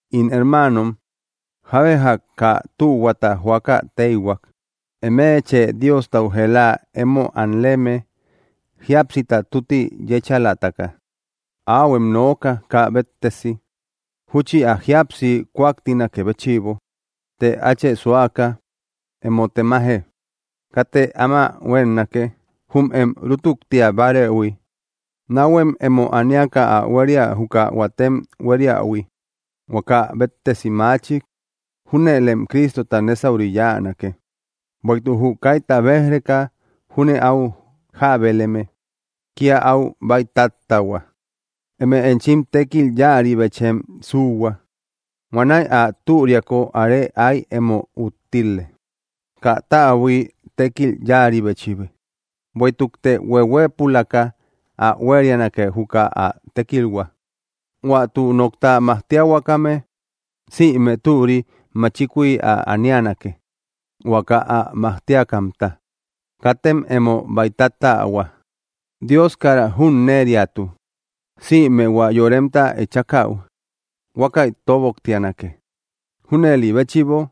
In hermaanom, jábe jak kaa tühuata joaka téihuak, eme chë Diostau jëla emo anleme jíapsita tutti yéchalataka, áuhuem nooka kaa béttesi, júchi ä jíapsi kuaktinakë béchïbo. Të áachë suaka, emo temaje; katë áma huénnake, jum em rútuktia bárëhui. Náhuem emo aniaka ä huéria juka huatem hueriähui, huaka béttesi maachik; júnëlem Cristota nésauri yáanake. Bueïtuk jü kaita béj‑reka júne áu jábeleme, kía áu bäitattähua. Eme enchim tékil yáaribechem suuhua, huanäi ä türiako are ái emo úttile, kaa täbui tékil yáaribechi. Bueïtukte hueuhuëpulaka ä huérianake juka ä tékilhua. Huä tü nokta majtiahuakame, sïme türi máchikui ä anianake, huaka ä majtiakamta. Katem emo bäitattähua; Dios kara junneriatu. Sïme hua yoremta echakäu, huákäi toboktianake. Júnëli béchïbo,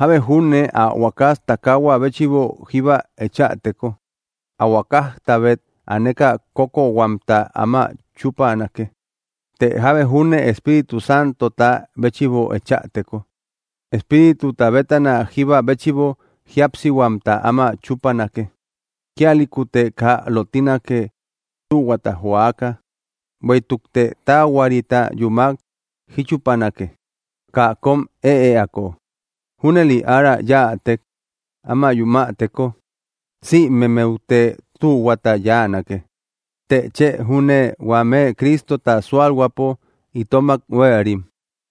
jábe junne ä huakas takahua béchïbo jíba echäteko, ä huakajtabét aneka kókkohuamta áma chupanake; të jábe júne Espíritu Santota béchïbo echäteko, Espírituta bétana jíba béchïbo jíapsihuamta áma chupanake. Kíalïkute kaa lottinake, tühuata joaka; bueïtukte taahuarita yúmak jíchupanake, kaa kóm ëeako. Júnëli arä yätek, áma yumäteko sïmemmeute tühuata yáanake, të chë júne huame Cristota súalhuäpo itomak huéerim.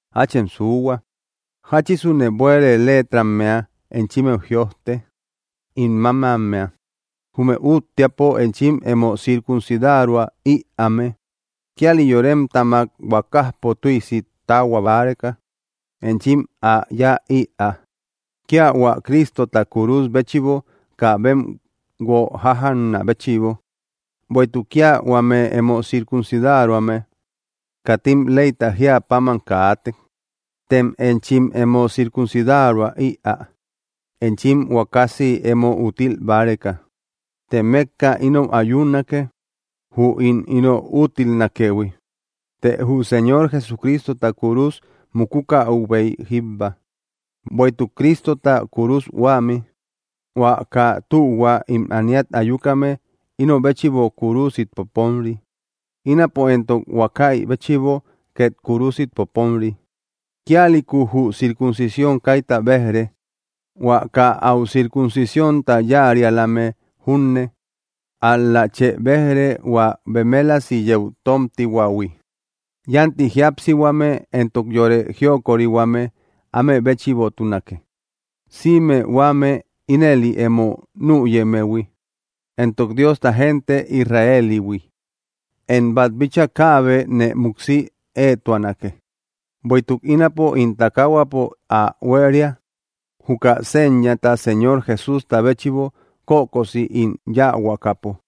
Áachem suuhua, jáchisune bueere leetrammea enchimmeu jïojte, ín mámammea. Jume úttiapo enchim emo circuncidaroä ïaame, kíalim yoremtamak huakajpo tüisi tahua báreka, enchim ä yáa ïa, kía hua Cristota kúrus béchïbo kaa bem guo jájjanä béchïbo. Bueïtuk kía huame emo circuncidaroame katim leyta jíä páman kaate; tem enchim emo circuncidaroä ïaa, enchim huakasiy emo úttil báreka. Të mékka inou ayunake, jü ín ino úttilnakëhui; të jü Señor Jesucristota kúrus mukukäubéy jíbba. Bueïtuk Cristota kúrus huämi, hua kaa tühua ím ániat ayukame ino béchïbo kúrusit poponri; ínapo éntok huákäi béchïbo két kúrusit poponri. Kíalïku jü circuncisión kaita béj‑re, hua kaa áu circuncisiónta yáarialame junne, ál‑la chë béj‑re hua bemelasi yeu tómtihuähui. Yánti jíapsihuame éntok yore jiokorihuame áme béchïbotunake, sïme huame ínëli emo nüyemmehui, éntok Diosta gente Israelihui. Én bát bíchaa kaabe nee múksi éetuanake, bueïtuk ínapo ín takahuapo ä huéria, juka señata Señor Jesústa béchïbo kökosi ín yáahuakapo.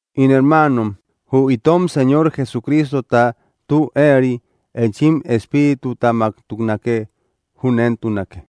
In hermaanom, jü itom Señor Jesucristota tü éeri enchim espíritutamaktunake. Júnentunake.